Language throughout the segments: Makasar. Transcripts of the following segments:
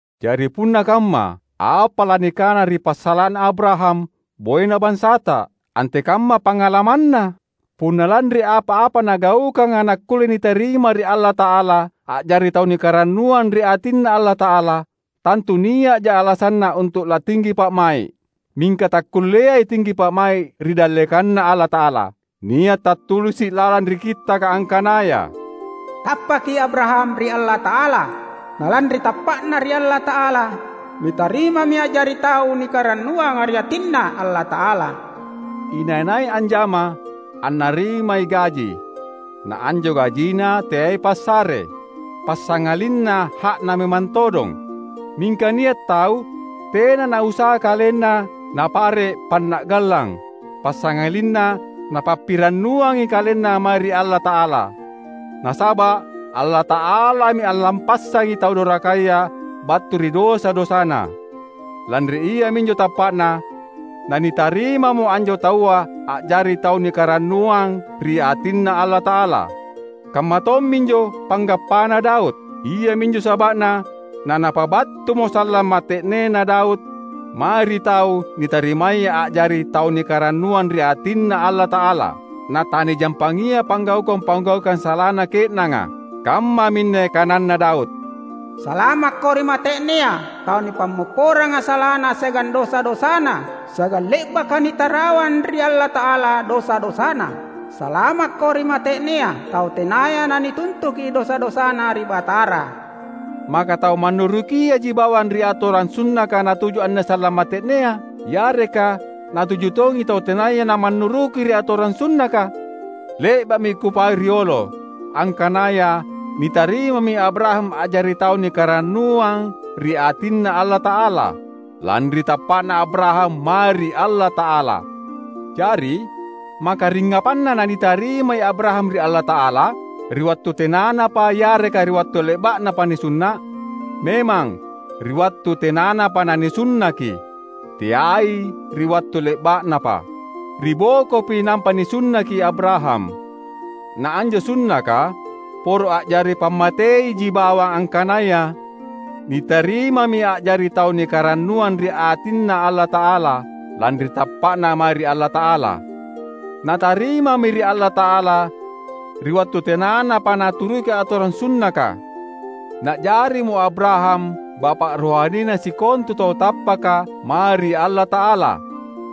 Jari punna kamma, apa lanikana ri passala’na Abraham, boena bansata? Antekamma pangalamanna? Punna lanri apa-apa nagaukanga nakkulle nitarima ri Allata’ala a’jari tau nikarannuang ri atinNa Allata’ala, tantu nia’ja alasanna untu’ latinggi pa’mai’. Mingka takkulleai tinggi pa’mai’ ri dallekanNa Allata’ala. Nia’ tattulisi’ lalang ri Kittaka angkanaya, "Tappaki Abraham ri Allata’ala; na lanri tappa’na ri Allata’ala, nitarimami a’jari tau nikarannuanga ri atinNa Allata’ala." Inai-nai anjama, annarimai gaji; na anjo gajina teai passare, passangalinna ha’na memang todong. Mingka nia’ tau tena nausaha kalenna napare’ panna’gallang; passangalinna napappirannuangi kalenna mae ri Allata’ala, nasaba’ Allata’alami allappassangi tau dorakaya battu ri dosa-dosana. Lanri iaminjo tappa’na nanitarimamo anjo taua a’jari tau nikarannuang ri atinNa Allata’ala. Kamma tomminjo panggappana Daud; iaminjo saba’na nanapabattumo sallang mate’nena Daud mae ri tau nitarimaya a’jari tau nikarannuang ri atinNa Allata’ala, Natanijampangia panggaukang-panggaukang salana ke’nanga. Kammaminne kananna Daud, "Salamakko ri mate’nea tau nipammopporanga salana siagang dosa-dosana siagang le’baka nitarawang ri Allata’ala dosa-dosana! Salamakko ri mate’nea tau tenaya nanituntuki dosa-dosana ri Batara!" Maka tau mannurukiaji bawang ri atorang sunnaka natuju anne sallang mate’nea? Yareka natuju tongi tau tenaya namannuruki ri atorang sunnaka? Le’ba’mi kupau riolo, angkanaya nitarimami Abraham a’jari tau nikarannuang ri atinNa Allata’ala, lanri tappa’na Abraham mae ri Allata’ala. Jari, maka ringngapanna nanitarimai Abraham ri Allata’ala? Ri wattu tenanapa yareka ri wattu le’ba’napa nisunna’? Memang, ri wattu tenanapa nanisunnaki, teai ri wattu le’ba’napa. Ri bokopi nampa nisunnaki Abraham. Na anjo sunnaka poro a’jari pammateiji bawang angkanaya nitarimami a’jari tau nikarannuang ri atinNa Allata’ala, lanri tappa’na mae ri Allata’ala. Natarimami ri Allata’ala ri wattu tenanapa naturuki atorang sunnaka. Na’jarimo Abraham bapa’ rohanina sikontu tau tappaka mae ri Allata’ala;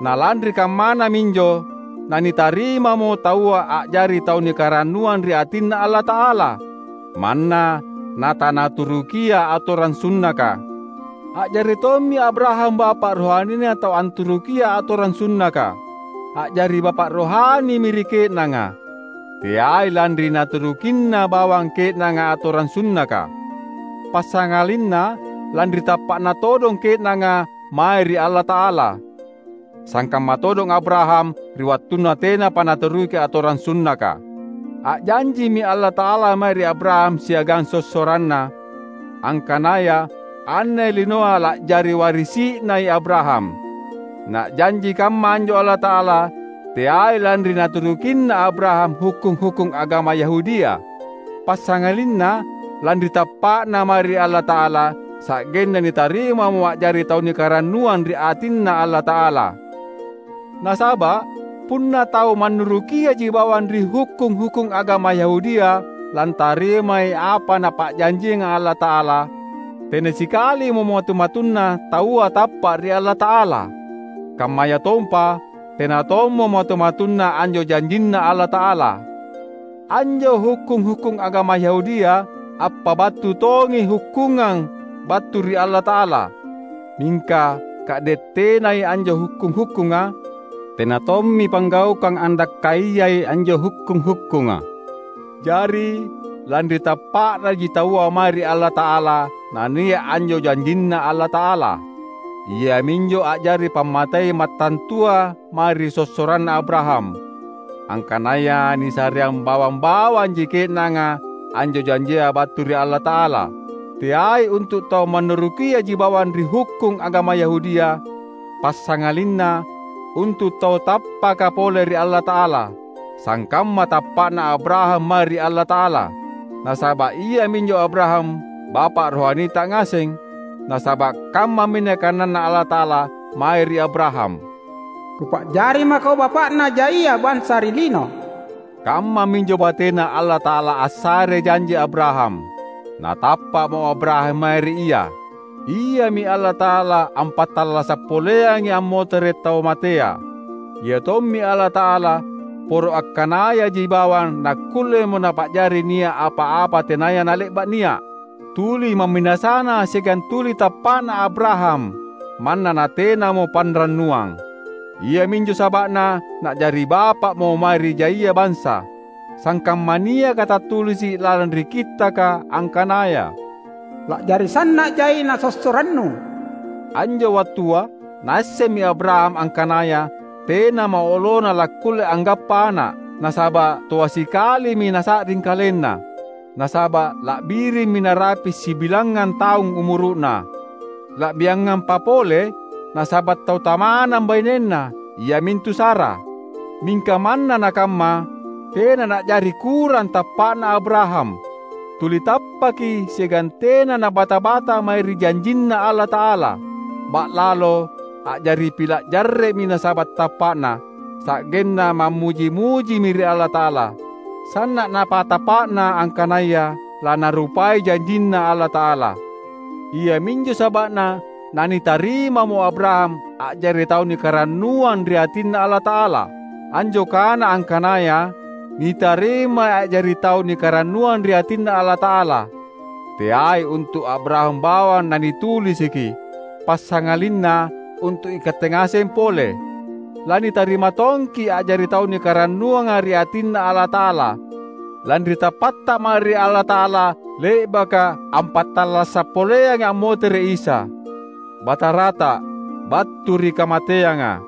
na lanri kammana minjo nanitarimamo taua a’jari tau nikarannuang ri atinNa Allata’ala, manna natanaturukia atorang sunnaka. A’jari tommi Abraham bapa’ rohanina tau anturukiai atorang sunnaka. A’jari bapa’ rohanimi ri ke’nanga, teai lanri naturukinna bawang ke’nanga atorang sunnaka, passangalinna lanri tappa’na todong ke’nanga mae ri Allata’ala, sangkamma todong Abraham ri wattunna tenapa naturuki atorang sunnaka. A’janjimi Allata’ala mae ri Abraham siagang sossoranna, angkanaya anne linoa la’jari warisi’nai Abraham. Na’janji kamma anjo Allata’ala teai lanri naturukinna Abraham hukkung-hukkung agama Yahudia, passangalinna lanri tappa’na mae ri Allata’ala sa’genna nitarimamo a’jari tau nikarannuang ri atinNa Allata’ala. Nasaba’ punna tau mannurukiaji bawang ri hukkung-hukkung agama Yahudia lantarimai apa Napa’janjianga Allata’ala, tena sikalimo matu-matunna taua tappa’ ri Allata’ala; kammayatompa tena tommo matu-matunna anjo janjinNa Allata’ala. Anjo hukkung-hukkung agama Yahudia appabattu tongi hukkungang battu ri Allata’ala. Mingka ka’de’ tenai anjo hukkung-hukkunga, tena tommi panggaukang andakkaiyai anjo hukkung-hukkunga. Jari lanri tappa’naji taua mae ri Allata’ala nania’ anjo janjinNa Allata’ala. Iaminjo a’jari pammatei mattantua mae ri sossoranna Abraham, angkanaya nisareang bawang-bawanji ke’nanga anjo janjia battu ri Allata’ala; teai untu’ tau mannurukiaji bawang ri hukkung agama Yahudia, passangalinna untu’ tau tappaka pole ri Allata’ala, sangkamma tappa’na Abraham mae ri Allata’ala. Nasaba’ iaminjo Abraham bapa’ rohanita ngaseng. Nasaba’ kammaminne kananNa Allata’ala mae ri Abraham, "Kupa’jari mako bapa’na jaia bansa ri lino." Kammaminjo bateNa Allata’ala assarei janji Abraham. Natappa’mo Abraham mae ri Ia. Iami Allata’ala ampattallasa’ poleangai ammotere’ tau matea; Ia tommi Allata’ala poro akkanayaji bawang nakkullemo Napa’jari nia’ apa-apa tenaya nale’ba’ nia’. Tuli ma’minasana siagang tuli tappa’na Abraham manna natenamo panrannuang. Iaminjo saba’na na’jari bapa’mo mae ri jaia bansa. Sangkamma niaka tattulisi’ lalang ri Kittaka, angkanaya, "La’jari sanna’ jaina sossorannu." Anjo wattua naassemmi Abraham angkanaya tenamo olona lakkulle anggappa ana’, nasaba’ toa sikalimi nasa’ring kalenna, nasaba’ la’birimmi narapi’ sibilangngang taung umuru’na; la’biangampa pole, nasaba’ tau tamanang bainenna, iamintu Sara. Mingka manna nakamma, tena na’jari kurang tappa’na Abraham. Tuli tappaki siagang tena nabata-bata mae ri janjinNa Allata’ala. Ba’lalo, a’jari pila’ jarre’mi nasaba’ tappa’na; sa’genna mammuji-mujimi ri Allata’ala. Sanna’ napatappa’na angkanaya laNarupai janjinNa Allata’ala. Iaminjo saba’na nanitarimamo Abraham a’jari tau nikarannuang ri atinNa Allata’ala. Anjo kana angkanaya, "nitarimai a’jari tau nikarannuang ri atinNa Allata’ala," teai untu’ Abraham bawang nanitulisiki, passangalinna untu’ ikatte ngaseng pole. Lanitarima tongki’ a’jari tau nikarannuanga ri atinNa Allata’ala, lanri tappatta mae ri Allata’ala, le’baka ampattallasa’ poleangi ammotere’ Isa, Batarata, battu ri kamateanga.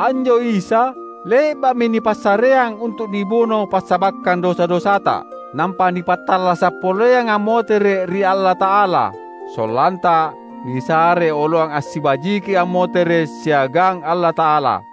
Anjo Isa le’ba’mi nipassareang untu’ nibuno passabakkang dosa-dosata; nampa nipattallasa’ poleang ammotere’ ri Allata’ala, sollanta nisare oloang assibajiki ammotere’ siagang Allata’ala.